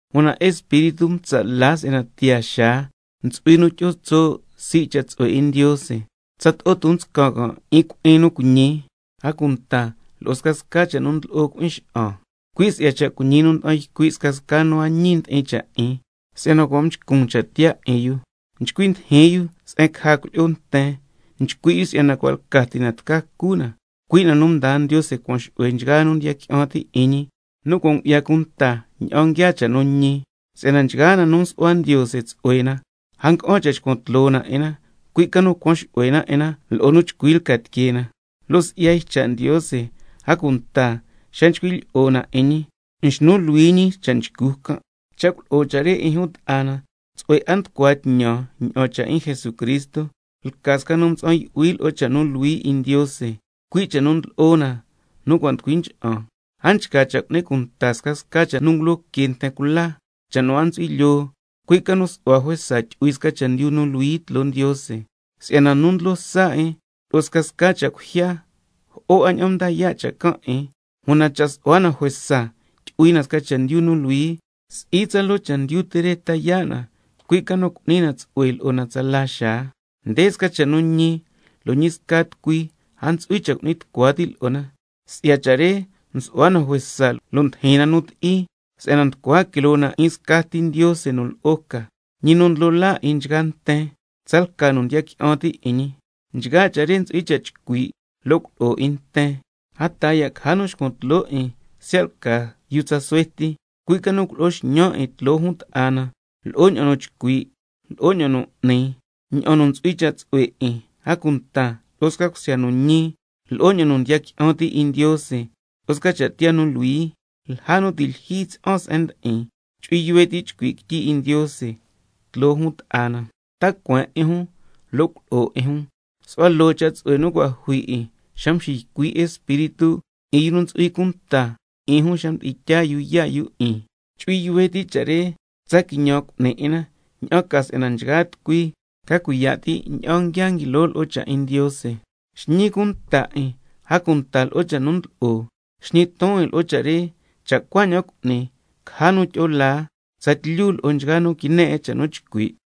Una Espíritu ntsa' la si'yana tiyaa xaa ntsu'hui nu tyi'o tso' sii' cha' tsu'hue 'in Ndiose, tsato'o ton nscan can' 'in cui'in nu cuiñi, a cunta lo'o scasca cha' nu ndlo'o cui'in xa'an, cui' si'ya cha' cuiñi nu nda'an ycui' scasca yu nu a ñi ndi'in cha' 'in, si'yana cua' mchcun cha' tiyaa 'in yu. Nchcui ndijin yu se'en caja cuilyi'o nten, nchcui' yu si'yana cua' lca ti na tca cu na, cui' na nu mdaa Ndiose cuan xu'hue nchgaa nu ndiya qui'an ti' 'in ñi, nu cua' ngu'ya cunta ña'an nguiaa cha' nu ñi. Si'yana nchgaa na nu msu'hua Ndiose, tsu'hue na, a nga'an cha' xcuan tloo na 'in na, cui' ca nu cuan xu'hue na 'in na lo'o nu chcui lca tiquee na, lo' si'ya cha' 'in Ndiose xa nchcui' lyi'o na 'in ñi, nxnu luhui ñi cha' nchcu can'. Cha' culo'o cha' re 'in jun ta'a na, tsu'hue 'a nducua tñan ña'an cha' 'in Jesucristo, lca sca nu mtsa'an yu'hui lo'o cha' nu luhui 'in Ndiose, cui' cha' nu ndlo'o na nu cua' nducui ncha'an. A nchca cha' cu'ni cunta scasca cha' nu ngulo que nten cula, cha' nu a ntsu'hui lyoo, cui' ca nu su'hua juesa tyu'hui sca chendyu nu luhui tloo Ndiose. Si'yana nu ndlo sa 'in lo'o scasca cha' cuijya, jo'o 'a ña'an nda yaa' cha' can', una cha' su'hua na juesa tyu'hui na sca chendyu nu luhui, si'i tsaloo chendyu ti re ta yaa' na, cui' ca nu cu'ni na tsu'hue lo'o na tsala xaa. Nde sca cha' nu ñi, lo' ñi sca tucui a ntsu'hui cha' cu'ni tucua ti' lo'o na. Si'ya cha' re can' cha' nsu'hua na juesa, ndijin na nu ti'i, si'yana nducua quiloo na 'in scati Ndiose nu lo'o ca, Ñi nu Ndlo laa 'in nchgaa nten, tsalca nu ndiya qui'an ti' 'in ñi. Nchgaa cha' re ntsu'hui cha' chcui' lo' culo'o 'in nten. A taa ya' caja nu xcuan tloo 'in siya' lca yu tsa suhue ti, cui' ca nu culo'o xñan 'in tloo jun ta'a na lo'o ña'an nu nchcui', lo'o ña'an nu n'ni, ña'an nu ntsu'hui cha' tsu'hue 'in, a cunta lo'o sca cusya nu ñi, lo'o ña'an nu ndiya qui'an ti' 'in Ndiose, lo'o sca cha' tiyaa nu luhui. Lja nu ti' lyijyi tyi'an se'en ndi'in, chu'hui yuhue ti' chcui' quityi 'in Ndiose tloo jun ta'a na, ta cueen 'in jun lo' culo'o 'in jun. Su'hua loo cha' tsu'hue nu cua' jui 'in xa nu mxiycui' Espíritu 'in yu nu ntsu'hui cunta 'in jun xa mdi'in tyaa yu yaa' yu 'in. Chu'hui yuhue ti' cha' re, tsa quiñan cu'ni 'in na, ña'an ca si'yana nchgaa tucui ca cuiya' ti' ña'an nguia nguilo lo'o cha' 'in Ndiose. Xñi cunta 'in, a cunta lo'o cha' nu ndlo'o. Xñi ton 'in lo'o cha' re, cha' cuaña'an cu'ni, caja ña'an tyi'o laa tsatlyu lo'o nchgaa nu quine 'in cha' nu nchcui'. Ña'an ntsu'hui cha' tyi'in na.